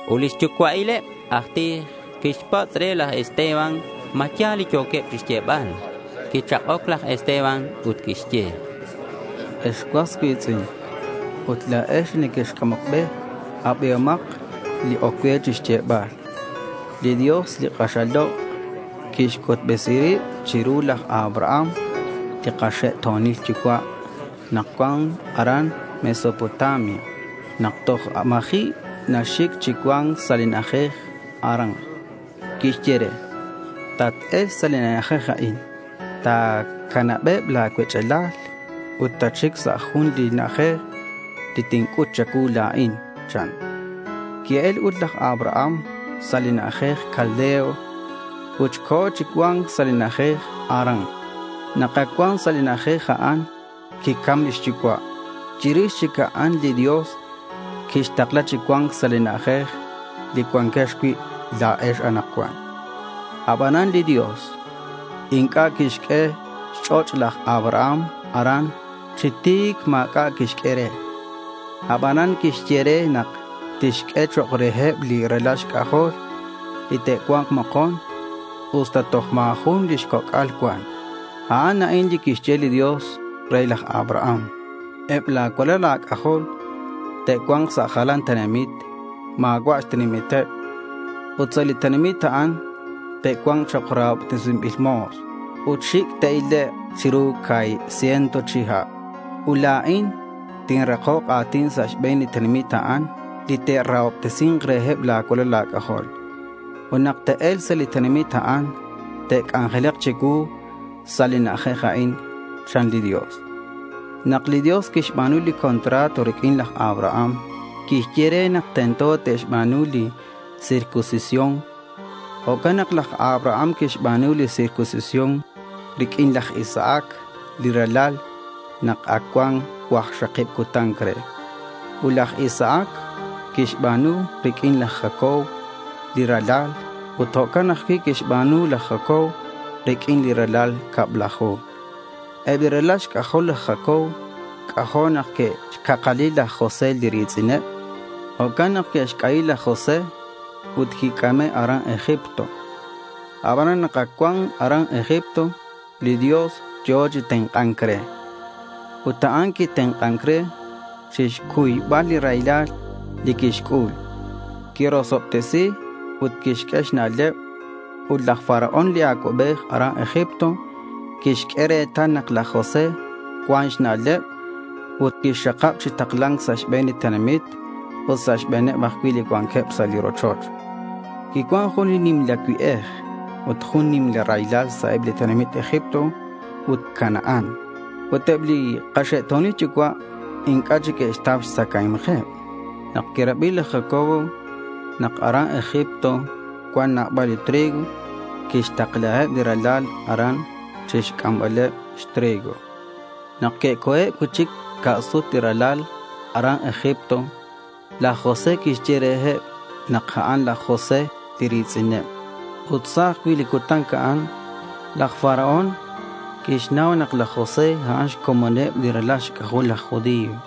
Ut li xyucua'il eb laj tij quixpatz' re laj Esteban ma ya̱l li yo̱queb chixyebal. Quichak'oc laj Esteban ut quixye: —Ex cuas cui̱tz'in ut la̱ex li nequexc'amoc be, abihomak li oc cue chixyebal. Li Dios li k'axal lok' quixc'utbesi rib chiru laj Abraham li kaxe'to̱nil yucua' nak cuan aran Mesopotamia nak toj ma̱ji' naxic chi cua̱nc sa' li na'ajej Harán. Quixye re: —Tat-e̱lk sa' li na'ajej a'in. Ta̱canabeb la̱ cuech'alal ut tatxic sa' jun li na'ajej li tinc'ut cha̱cuu la̱in, chan. Qui-el ut laj Abraham sa' li na'ajej Caldeo ut co̱ chi cua̱nc sa' li na'ajej Harán. Nak ac cuan sa' li na'ajej a'an quicam lix yucua'. Ut chirix a'an li Dios quixtakla chi cua̱nc sa' li na'ajej li cuanquex cui' la̱ex anakcuan. Abanan li Dios inc'a' quixq'ue xch'och' laj Abraham aran. Chi ti̱c ma̱c'a' quixq'ue re. Abanan quixye re nak tixq'ue chok' reheb li ralal xc'ajol li te'cua̱nk mokon usta toj ma̱ jun lix coc'al cuan. A'an a'in li quixye li Dios re laj Abraham: —Eb la̱ cualal a̱c'ajol te'cua̱nk sa' jalan tenamit ma̱cua' xtenamiteb. Ut sa' li tenamit a'an te'cua̱nk chok' rahobtesinbil mo̱s ut xic' te'ilek' chiru ca̱hib ciento chihab. Ut la̱in tinrakok a̱tin sa' xbe̱n li tenamit a'an li te'rahobtesi̱nk reheb la̱ cualal a̱c'ajol. Ut nak te'e̱lk sa' li tenamit a'an te'c'anjelak chicuu sa' li na'ajej a'in, chan li Dios. Nak li Dios quixba̱nu li contrato riq'uin laj Abraham quixye re nak tento te'xba̱nu li circuncisión. Jo'can nak laj Abraham quixba̱nu li circuncisión riq'uin laj Isaac li ralal nak ac cuan cuakxakib cutan re. Ut laj Isaac quixba̱nu riq'uin laj Jacob li ralal ut jo'can ajcui' quixba̱nu laj Jacob riq'uineb li ralal cablaju. Eb li ralal laj Jacob c'ajo' nak que'xcakali laj José li ri̱tz'ineb. Jo'can nak que'xc'ayi laj José ut quic'ame' aran Egipto. Abanan nak ac cuan aran Egipto, li Dios yo̱ chi tenk'a̱nc re. Ut a'an quitenk'an re chixcuybal li raylal li quixc'ul. Quirosobtesi ut quixq'ue xna'leb. Ut laj Faraón li acuabej aran Egipto quixq'ue retal nak laj José cuan xna'leb ut quixxakab chi takla̱nc sa' xbe̱n li tenamit ut sa' xbe̱neb ajcui' li cuanqueb sa' li rochoch. Ut quicuan jun nimla cue'ej ut jun nimla raylal sa' eb li tenamit Egipto ut Canaán. Ut eb li kaxe'to̱nil yucua' inc'a' chic que'xtau xtzacae̱mkeb. Nak quirabi laj Jacob nak aran Egipto cuan nabal li trigo, quixtaklaheb li ralal aran chixc'ambaleb xtrigo. Nak que'co̱eb cui'chic xca' sut li ralal aran Egipto, laj José quixye reheb nak a'an laj José li ri̱tz'ineb. Ut sa' ajcui' li cutan a'an laj Faraón quixnau nak laj José, a'an xcomoneb li ralal xc'ajoleb laj judío.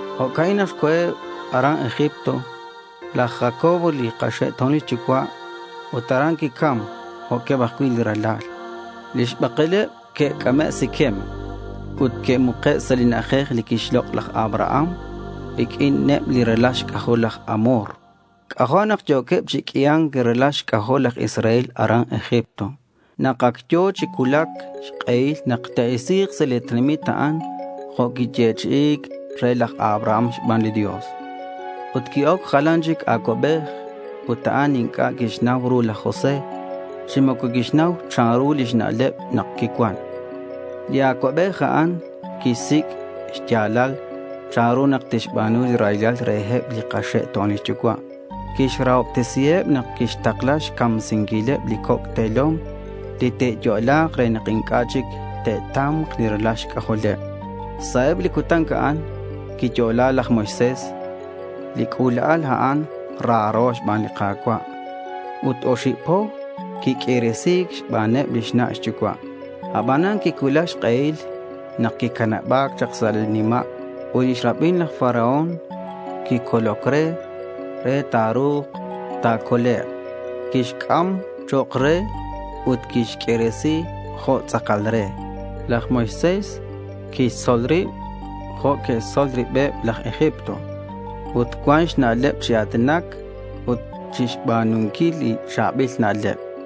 Jo'ca'in nak co̱eb aran Egipto laj Jacob li kaxe'to̱nil yucua' ut aran quicam jo'queb ajcui' li ralal. Lix bakeleb que'c'ame' Siquem ut que'muke' sa' li na'ajej li quixlok' laj Abraham riq'uineb li ralal xc'ajol laj Hamor. C'ajo' nak yo̱queb chi q'uia̱nc li ralal xc'ajol laj Israel aran Egipto nak ac yo̱ chi cuulac xk'ehil nak te'isi̱k sa' li tenamit a'an jo' quiyechi'i̱c re laj Abraham xban li Dios. Ut qui-oc jalan chic acuabej ut a'an inc'a' quixnau ru laj José chi moco quixnau chanru lix na'leb nak quicuan. Li acuabej a'an quixsic' xya̱lal chanru nak tixba̱nu raylal reheb li kaxe'to̱nil yucua'. Quixrahobtesiheb nak quixtakla xcamsinquileb li coc' te̱lom li te'yo'la̱k re nak inc'a' chic te'ta̱mk li ralal xc'ajoleb. Sa' eb li cutan a'an quiyo'la laj Moisés. Li c'ula'al a'an raro xban li Ka̱cua'. Ut oxib po quiq'uiresi̱c xbaneb lix na' xyucua'. Abanan quicuulac xk'ehil nak quicanaba̱c chak sa' li nima' ut lix rabin laj Faraón quixococ re, re ta̱ru̱k ta̱colek'. Quixc'am chok' re ut quixq'uiresi jo' tz'akal re. Laj Moisés quixtzol rib jo' neque'xtzol ribeb laj Egipto. Ut cuan xna'leb chi a̱tinac ut chixba̱nunquil li cha̱bil na'leb.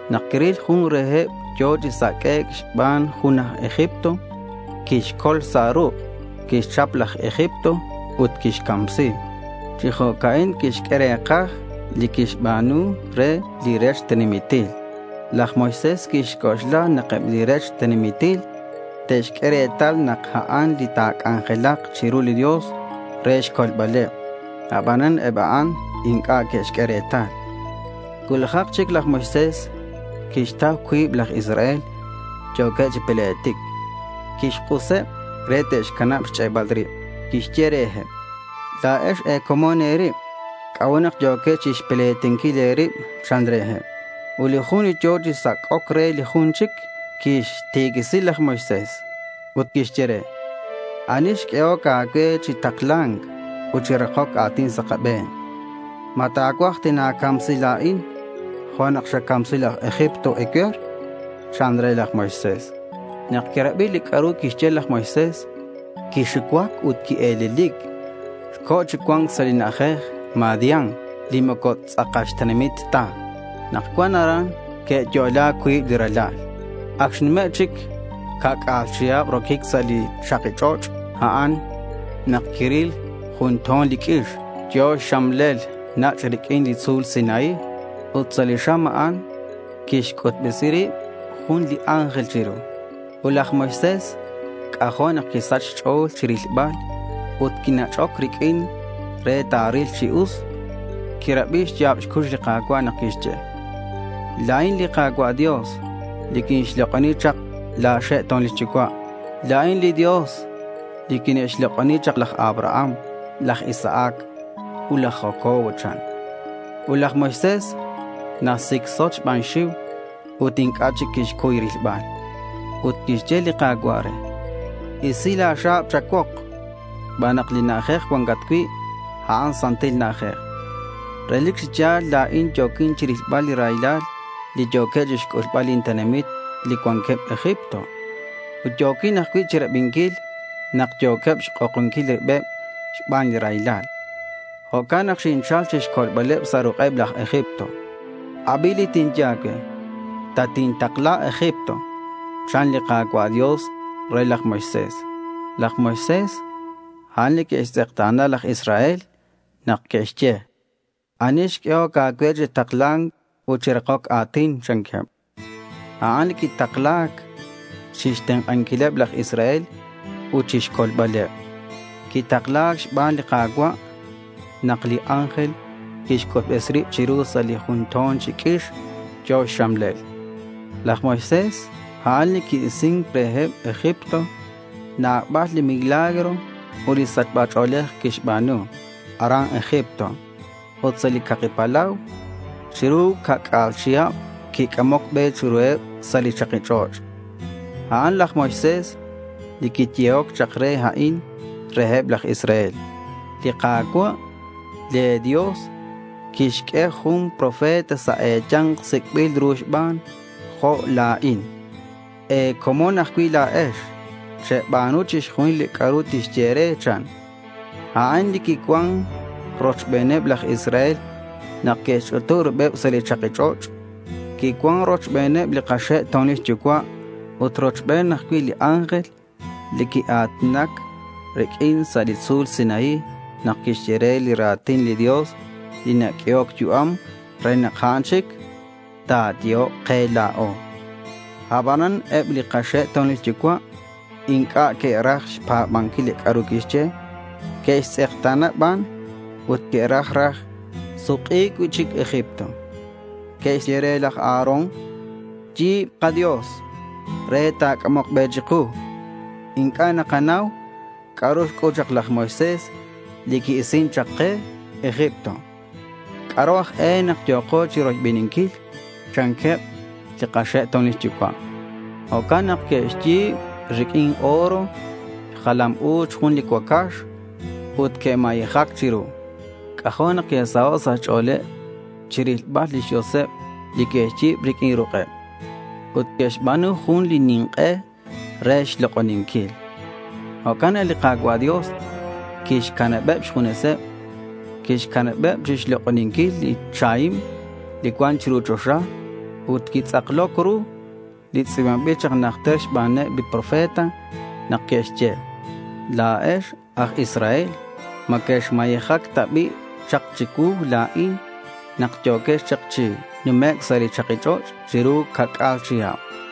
Nak quiril jun reheb yo̱ chi saq'uec' xban jun aj Egipto, quixcol sa' ruk'. Quixchap laj Egipto ut quixcamsi. Chi jo'ca'in quixq'ue re̱kaj li quixba̱nu re li rech tenamitil. Laj Moisés quixc'oxla nak eb li rech tenamitil te'xq'ue retal nak a'an li ta̱c'anjelak chiru li Dios re xcolbaleb. Abanan eb a'an inc'a' que'xq'ue retal. Cuulajak chic laj Moisés quixtau cuib laj Israel yo̱queb chi pletic. Quixk'useb re te'xcanab xch'e'bal rib. Quixye reheb: —La̱ex e̱comon e̱rib. ¿C'a'ut nak yo̱quex chixpletinquil e̱rib? chan reheb. Ut li jun li yo̱ chi sac'oc re li jun chic quixtiquisi laj Moisés ut quixye re: —¿Ani xq'uehoc a̱cue chi takla̱nc ut chi rakoc a̱tin sa' kabe̱n? ¿Ma ta̱cuaj tina̱camsi la̱in jo' nak xacamsi laj Egipto ecue̱r? chan re laj Moisés. Nak quirabi li c'a'ru quixye, laj Moisés quixucuac ut quie̱lelic. Co̱ chi cua̱nc sa' li na'ajej Madian li moco tz'akal xtenamit ta. Nak cuan aran, que'yo'la cuib li ralal. Ac xnume' chic ca'c'a̱l chihab roquic sa' li chaki ch'och' a'an, nak quiril jun to̱n li q'uix yo̱ xxamlel nach' riq'uin li tzu̱l Sinaí. Ut sa' li xam a'an quixc'utbesi rib jun li ángel chiru. Ut laj Moisés c'ajo' nak quisach xch'o̱l chirilbal ut quinach'oc riq'uin re ta̱ril chi us. Quirabi xya̱b xcux li Ka̱cua' nak quixye: —La̱in li Ka̱cua' Dios li que'xlok'oni chak la̱ xe'to̱nil yucua'. La̱in li Dios li que'xlok'oni chak laj Abraham, laj Isaac, ut laj Jacob, chan. Ut laj Moisés nasicsot xban xxiu ut inc'a' chic quixcuy rilbal. Ut quixye li Ka̱cua' re: —Isi la̱ xa̱b cha̱cuok xban nak li na'ajej cuancat cui', a'an santil na'ajej. Relic chi ya̱l la̱in yo̱quin chirilbal li raylal li yo̱queb chixc'ulbal lin tenamit li cuanqueb Egipto. Ut yo̱quin ajcui' chirabinquil nak yo̱queb xk'okonquil ribeb xban li raylal. Jo'can nak xinchal chixcolbaleb sa' ruk'eb laj Egipto. Abi li tinye a̱cue. Tatintakla Egipto, chan li Ka̱cua' re laj Moisés. Laj Moisés, a'an li que'xtz'ekta̱na laj Israel nak que'xye: —¿Ani xq'uehoc a̱cue chi takla̱nc ut chi rakoc a̱tin? chanqueb. A'an li quitakla̱c chixtenk'anquileb laj Israel ut chixcolbaleb. Quitakla̱c xban li Ka̱cua' nak li ángel quixc'utbesi rib chiru sa' li jun to̱n chi q'uix yo̱ xxamlel. Laj Moisés, a'an li qui-isin reheb Egipto. Nabal li milagro ut li sachba ch'o̱lej quixba̱nu aran Egipto ut sa' li Caki Palau. Chiru ca'c'a̱l chihab quic'amoc be chiruheb sa' li chaki ch'och'. A'an laj Moisés li quiyehoc chak re a'in reheb laj Israel: —Li Ka̱cua' le̱ Dios tixq'ue junak profeta sa' e̱ya̱nk sic'bil ru xban jo' la̱in. E̱comon ajcui' la̱ex. Cheba̱nu chixjunil li c'a'ru tixye e̱re, chan. A'an li quicuan rochbeneb laj Israel nak que'xch'utub ribeb sa' li chaki ch'och'. Quicuan rochbeneb li kaxe'to̱nil yucua' ut rochben ajcui' li ángel li quia̱tinac riq'uin sa' li tzu̱l Sinaí nak quixye re li ra̱tin li Dios li naq'uehoc yu'am re nak a'an chic ta̱yehok ke la̱o. Abanan eb li kaxe'to̱nil yucua' inc'a' que'raj xpa̱banquil li c'a'ru quixye. Que'xtz'ekta̱na ban ut que'raj raj suk'i̱c cui'chic Egipto. Que'xye re laj Aarón: —Yi̱b kadios re te'c'amok be chiku. Inc'a' nakanau c'a'ru xc'ul chak laj Moisés li qui-isin chak ke Egipto. ¿C'a'ru aj e nak yo̱ko chiroybeninquil? chanqueb li kaxe'to̱nil yucua'. Jo'can nak que'xyi̱b riq'uin oro xjalam u̱ch jun li cuacax ut que'mayejac chiru. C'ajo' nak que'saho' sa' xch'o̱leb chirilbal lix dioseb li que'xyi̱b riq'uin ruk'eb. Ut que'xba̱nu jun li nink'e re xlok'oninquil. Jo'can nak li Ka̱cua' Dios quixcanabeb xjuneseb. Quixcanabeb chixlok'oninquil li chahim li cuan chiru choxa. Ut quitz'akloc ru li tz'i̱banbil chak najter xbaneb li profeta nak que'xye: La̱ex aj Israel, ¿ma quexmayejac ta bi' chak chicuu la̱in nak yo̱quex chak chi numec' sa' li chaki ch'och' chiru ca'c'a̱l chihab?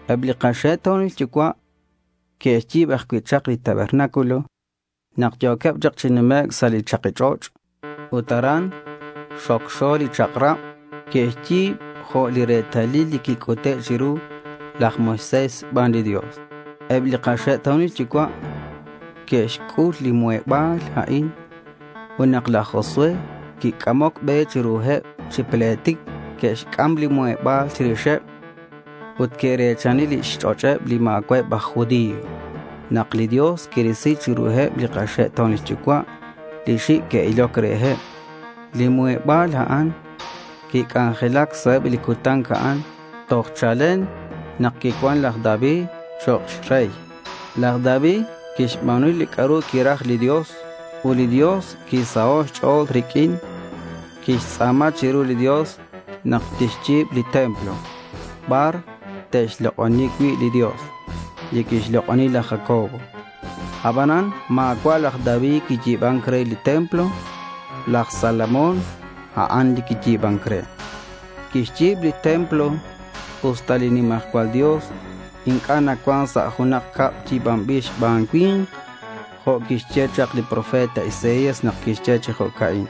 Eb li kaxe'to̱nil yucua' que'xyi̱b ajcui' chak li tabernáculo nak yo̱queb chak chi numec' sa' li chaki ch'och' ut aran xocxo li chak'rab. Que'xyi̱b jo' li retalil li quic'ute' chiru laj Moisés xban li Dios. Eb li kaxe'to̱nil yucua' que'xc'ul li muheba̱l a'in. Ut nak laj Josué quic'amoc be chiruheb chi pletic, que'xc'am li muheba̱l chirixeb. Ut que're̱chani lix ch'och'eb li ma̱cua'eb aj judío nak li Dios quirisi chiruheb li kaxe'to̱nil yucua' li xic' que'iloc reheb. Li muheba̱l a'an quic'anjelac sa' eb li cutan a'an toj chalen nak quicuan laj David chok' rey. Laj David quixba̱nu li c'a'ru quiraj li Dios, ut li Dios quisaho' xch'o̱l riq'uin. Quixtz'a̱ma chiru li Dios nak tixyi̱b li templo bar te'xlok'oni cui' li Dios li quixlok'oni laj Jacob. Abanan ma̱cua' laj David quiyi̱ban re li templo. Laj Salomón, a'an li quiyi̱ban re. Quixyi̱b li templo usta li nimajcual Dios inc'a' nacuan sa' junak cab yi̱banbil xban cui̱nk jo' quixye chak li profeta Isaías nak quixye chi jo'ca'in: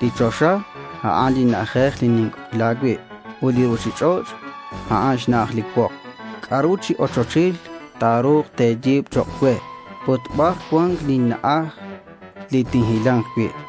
Li choxa, a'an li na'ajej li ninc'ojla cui' ut li ruchich'och', a'an xna'aj li cuok. ¿C'a'ru chi ochochil ta̱ru̱k te̱yi̱b chok' cue? Ut, ¿bar cuan lin na'aj li tinhila̱nk cui'?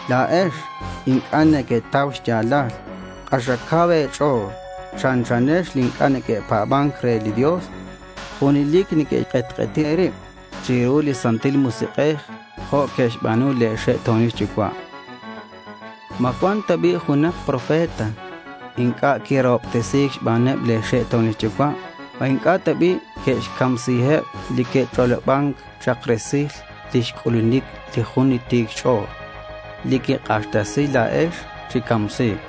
La̱ex inc'a' nequetau xya̱lal. K'axal cau e̱ch'o̱l. Chanchanex li inc'a' neque'pa̱ban re li Dios. Junelic nequek'etk'eti e̱rib chiru li Santil Musik'ej jo' que'xba̱nu le̱ xe'to̱nil yucua'. ¿Ma cuan ta bi' junak profeta inc'a' quirahobtesi̱c xbaneb le̱ xe'to̱nil yucua'? ¿Ma inc'a' ta bi' que'xcamsiheb li que'ch'oloban chak resil lix c'ulunic li jun li Ti̱c Xch'o̱l, li quek'axtesi la̱ex chi camsi̱c?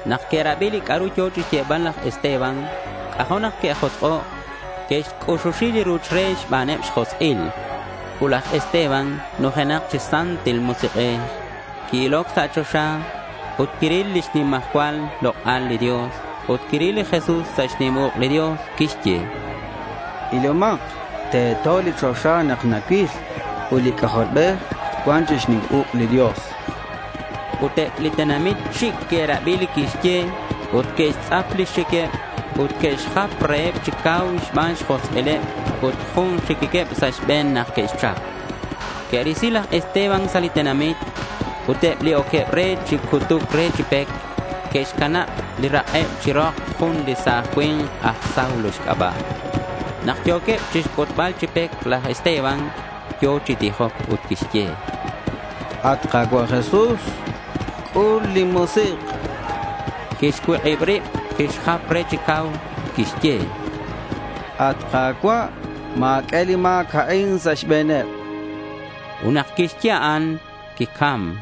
Nak que'rabi li c'a'ru yo̱ chixyebal laj Esteban, c'ajo' nak que'josk'o'. Que'xc'uxuxi li ruch re xbaneb xjosk'il. Ut laj Esteban nujenak chi Santil Musik'ej. Qui-iloc sa' choxa ut quiril lix nimajcual lok'al li Dios ut quiril li Jesús sa' xnim uk' li Dios. Quixye: —Ilomak. Teto li choxa nak nacuil ut li C'ajolbej cuan chi xnim uk' li Dios, chan. Ut eb li tenamit xic' que'rabi li quixye ut que'xtz'ap lix xiqueb ut que'xjap reheb chi cau xban xjosk'ileb ut jun xiquiqueb sa' xbe̱n nak que'xchap. Que'risi laj Esteban sa' li tenamit. Ut eb li oqueb re chi cutuc re chi pec, que'xcanab li rak'eb chi rok jun li sa̱j cui̱nk aj Saulo xc'aba'. Nak yo̱queb chixcutbal chi pec, laj Esteban yo̱ chi tijoc ut quixye: —At Ka̱cua' Jesús, c'ul lin musik'.— Quixcuik'ib rib, quixjap re chi cau ut quixye: —At Ka̱cua', ma̱q'ue li ma̱c a'in sa' xbe̱neb.— Ut nak quixye a'an, quicam.